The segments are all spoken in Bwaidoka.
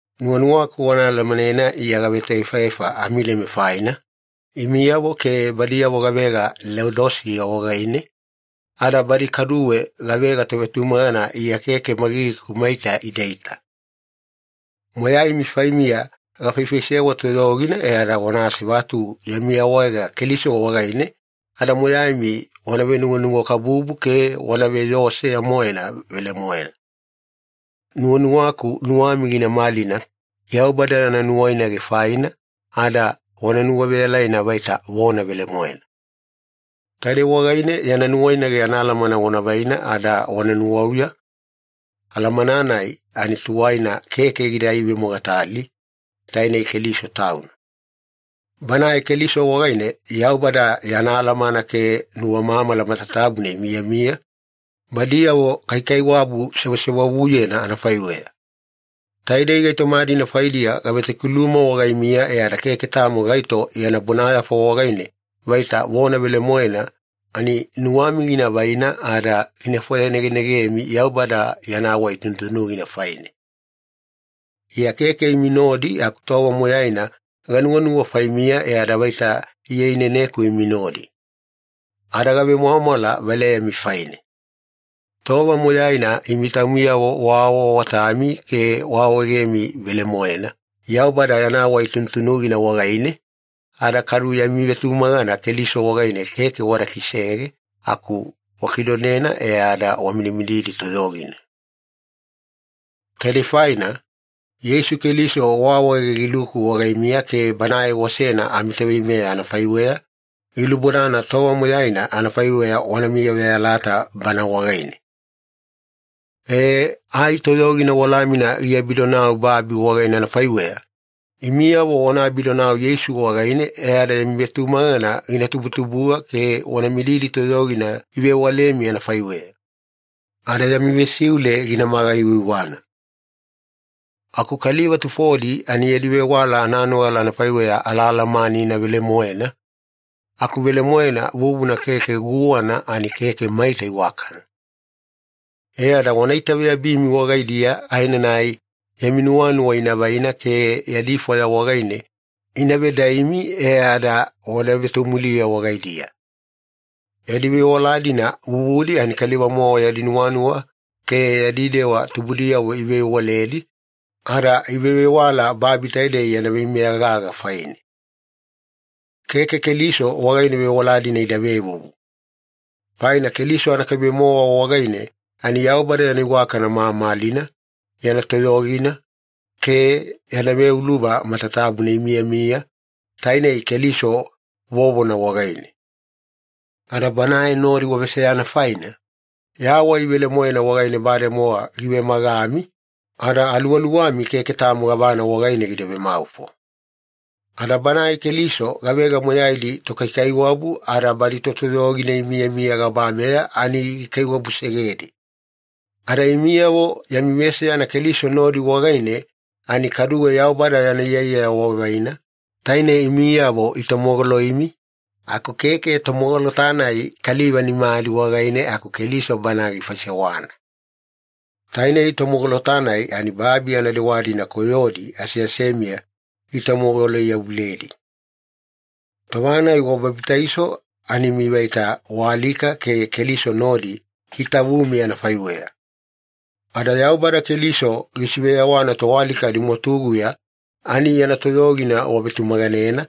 Nuwanuwaku wana alamanena Iya gavetoefaefa amileme faina, imiyavo ke badiyavo gavega Leodisiya wagaine, ada badi kaduwe gavega tovetumagana Iya keke magigiku maita idaita. Moyaimi faimiya gafaifaisewa toyogina, e ada wana asevatu yami awaega Keliso wagaine ada moyaimi wana venuwanuwakabubu ke wana veyoo seya-moena velemoena. Nuwanuwaku nuwami gina malina Yaubada yana nuwainage faina ada wana nuwaveyalaina vaita vona velemoena. Taidei wagaine yana nuwainage anaalamana wana vaina ada wana nuwauya, alamana-nai ani tuwaina keke gida ivemogatali, tainei Keliso Tauna. Banae Keliso wagaine Yaubada yana alamana ke nuwamamala matatabuna imiyamiya, badiyavo kaikaiwabu sewasewavuyena anafaiweya. Taidei gaitoma-dina faidiya gavetokiluma wagaimiya e ada keke tamo gaito yana bonayafa wagaine vaita vona velemoena ani nuwami gina vaina ada gina fwayanegenegemi Yaubada yana wai tunutunugina faine. Iya keke imi nodi aku tova moyaina ganuwanuwa faimiya e ada vaita Iya ineneku imi nodi. Ada gavemwamwala valeyami faine. Tova moyaina imi taumiyavo waawaawatami ke waawaegemi velemoena Yaubada yana wai tunutunugina wagaine, ada kadu yami vetumagana Keliso wagaine keke wada kisege aku wakidonena e ada wamidimididi toyogina. Taidei faina, Yeisu Keliso waawaege giluku wagaimiya ke Banae wasena amiToveimeya anafaiweya, gilubodana tova moyaina anafaiweya wana miyaveyalata Bana wagaine. Ee, ai toyogina walamina giabidonau babi wagaine anafaiweya, imiyavo wana abidonau Yeisu wagaine e ada yami vetumagana gina tubutubuga ke wana mididi toyogina ivewalemi anafaiweya. Ada yami vesiule ginamaga aiwaiwana. Aku kaliva tufodi ani yadi vewala ananogala anafaiweya alaalamanina velemoena, aku velemoena vuvuna ke guwana ani keke maita iwakana. E ada wana itaveyabimi wagaidiya, aenanai yami nuwanuwa ina vaina ke yadi fwaya wagaine ina vedaimi e ada wana vetomuliya wagaidiya. Yadi vewala-dina vuvudi ani kaliva-mowa yadi nuwanuwa ke yadi dewa tubudiyavo ivevewaledi, ada ivevewala babi taidei yana veimeya gaga faine. Keke Keliso wagaine vewala-dina ida vevuvu. Faina Keliso anakaibe-mowa wagaine ani Yaubada yana iwakana mamalina, yana toyogina, ke yana veuluva matatabuna imiyamiya, taine Keliso vovona wagaine. Ada Banae nodi waveseyana faina, yawai velemoena wagaine bademowa givemagami, ada aluwaluwami keke tamo gavana wagaine gida vemaufo. Ada Banae Keliso gavega moyaidi tokaikaiwabu ada badi totoyogina imiyamiya gabameya ani gikaiwabusegedi. Ada imiyavo yami veseyana Keliso nodi wagaine ani kaduwe Yaubada yana iyaiyaya wavaina, taine imiyavo itomogoloimi, aku keke tomogolota-nai kaliva nimadi wagaine aku Keliso Bana gifaisewana. Tainei tomogolota-nai ani babi anadewa-dina koyodi aseasemiya gitomogoloi-yavuledi. Tova-nai wababitaiso ani imi vaita waalika ke Keliso nodi itavumi anafaiweya. Ada Yaubada Keliso gisiveyawana toalika adimwatuguya ani yana toyogina wavetumaganena,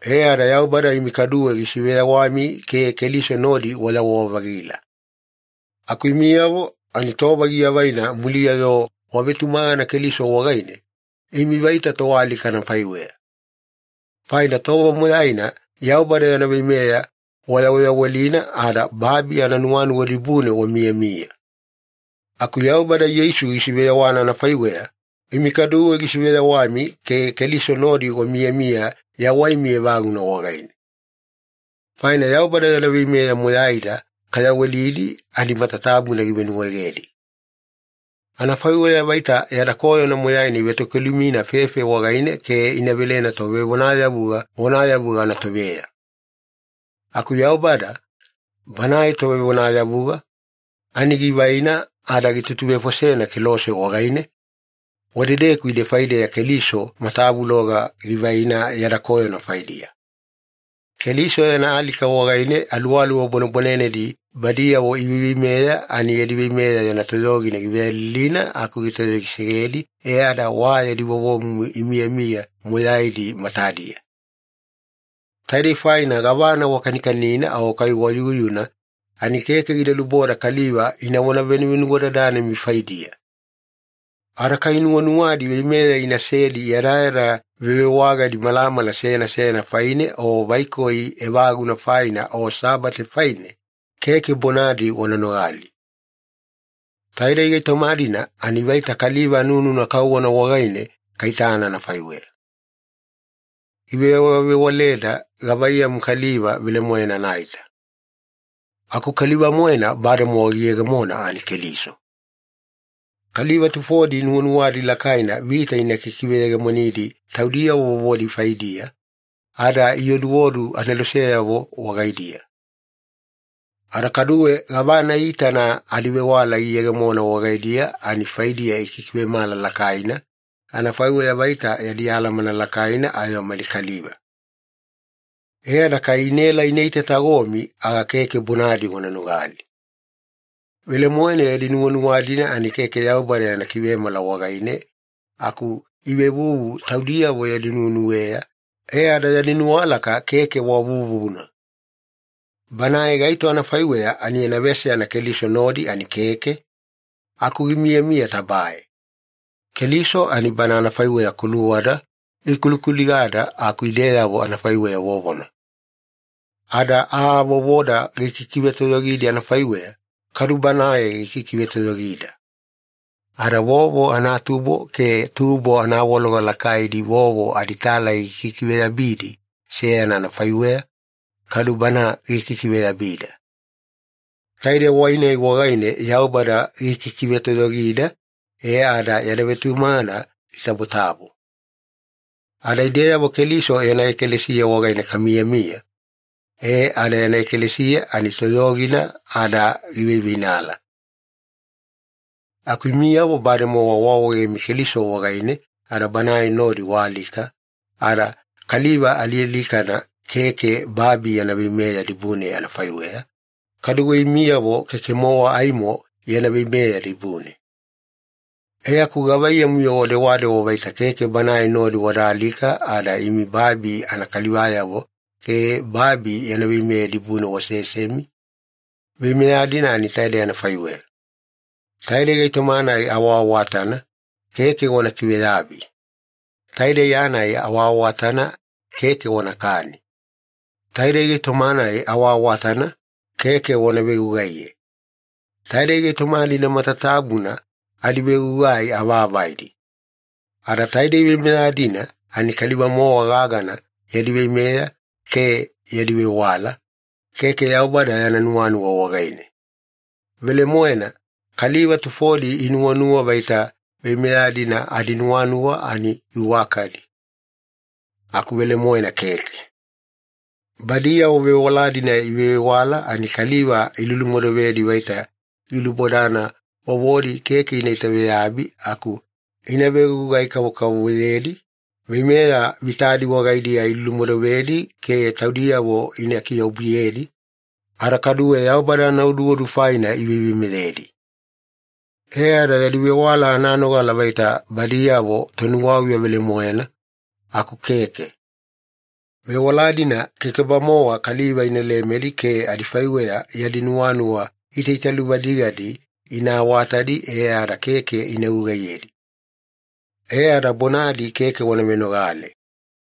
e ada Yaubada imi kaduwe gisiveyawami ke Keliso nodi wayawa-vagila. Aku imiyavo ani tova giavaina muliya-yo wavetumagana Keliso wagaine, imi vaita toalika anafaiweya. Faina tova moyaina Yaubada yana veimeya wayaweyawelina ada babi ananuwanuwa dibune wamiyamiya. Aku Yaubada Yeisu gisiveyawana anafaiweya, imi kaduwe gisiveyawami ke Keliso nodi wamiyamiya yawaimi evaguna wagaine. Faina Yaubada yana veimeya moyaida kayawelidi ani matatabuna givenuwaegedi. Anafaiweya vaita yada koyona moyaina ivetokilumina fefe wagaine ke ina velena tovevonayavuga vonayavuga anatoveya. Aku Yaubada, Banae Tovevonayavuga, ani givaina ada gitutuvefosena kelose wagaine, wadedeku ide faideya Keliso matavuloga givaina yada koyona faidiya. Keliso yana alika wagaine aluwaluwa bwanebwanenedi badiyavo iveiveimeya ani yadi veimeya yana toyogina giveyalilina aku gitoyogisegedi, e ada wa yadi vovomumu imiyamiya moyaidi matadiya. Taidei faina gavana wakanikanina o kai wayuyuna ani keke gida luboda kaliva inavona venuwadadanemi faidiya. Ada kai nuwanuwadi veimeya inasedi yadayada vevewagadi malamala seyana seyana faine, o vaikoi evaguna faina, o Sabate faine, keke bonadi wana nogali. Taidei gaitoma-dina ani vaita kaliva anununa kauwana wagaine kaitana anafaiweya. Givewavewaleda gavaiyamu kaliva velemoena anaita. Aku kaliva-moena bademowa giyegemona ani Keliso. Kaliva tufodi nuwanuwadi lakaina vita ina kikiveyegemonidi taudiyavo vovodi faidiya, ada ioduodu aneloseyavo wagaidiya. Ada kaduwe gavana iitana adivewala iyegemona wagaidiya ani faidiya ikikivemala lakaina, anafaiweya vaita yadi alamana lakaina ayo mali kaliva. E ada kai inaela ina itatagomi aga keke bonadi wana nogali. Velemoena yadi nuwanuwa-dina ani keke Yaubada yana kivemala wagaine aku ivevuvu taudiyavo yadi nuwenuweya, e ada yadi nuwalaka keke wa vuvuna. Banae gaito anafaiweya ani yana veseyana Keliso nodi ani keke, aku gimiyamiya tabae. Keliso ani Bana anafaiweya kuluwada gikulikuligada aku ideyavo anafaiweya vovona. Ada aa vovoda gikikivetoyogidi anafaiweya, kadu Banae gikikivetoyogida. Ada vovo anatubo ke tubo anawaloga lakaidi vovo aditalai ikikiveyabidi seyana anafaiweya, kadu Bana gikikiveyabida. Taide wai-nai wagaine Yaubada gikikivetoyogida e ada yada vetumagana gitabotabo. Ada ideyavo Keliso yana ekalesiya wagaine kamiyamiya, e ada yana ekalesiya ani toyogina ada giveiveinala. Aku imiyavo bademowa waawaegemi Keliso wagaine ada Banae nodi waalika, ada kaliva alialikana keke babi yana veimeya dibune anafaiweya, kaduwe imiyavo keke-mowa aimo yana veimeya dibune. E aku gavaiyamu-yo wadewadewa vaita keke Banae nodi wada alika ada imi babi anakalivayavo ke babi yana veimeya dibune wasesemi? Veimeya-dina ani taidei anafaiweya. “Taidei gaitoma-nai awaawatana, keke wana kiveyabi. Taidei aa-nai awaawatana, keke wanakani. Taidei gaitoma-nai awaawatana, keke wana vegugaiye.” Taidei gaitoma-dina matatabuna adivegugai avaavaidi. Ada taidei veimeya-dina ani kaliva-mowa gagana yadi veimeya ke yadi vewala, keke Yaubada yana nuwanuwa wagaine. Velemoena, kaliva tufodi inuwanuwa vaita veimeya-dina adinuwanuwa ani iwakadi. Aku velemoena keke. Badiyavo vewala-dina ivevewala ani kaliva ilulumodovedi vaita gilubodana vovodi keke ina itaveyabi aku ina vegugai kavokavovoyedi, veimeya vitadi wagaidiya ilulumodovedi ke taudiyavo ina kiobuyedi, ada kaduwe Yaubada anaoduodu faina iveiveimeyedi. E ada yadi vewala ananogala vaita badiyavo tonuwauya velemoena, aku keke. Vewala-dina keke-bamowa kaliva ina lemedi ke adifaiweya yadi nuwanuwa itaitaluvadigadi ina awatadi e ada keke ina gugaiyedi. E ada bonadi keke wana venogale.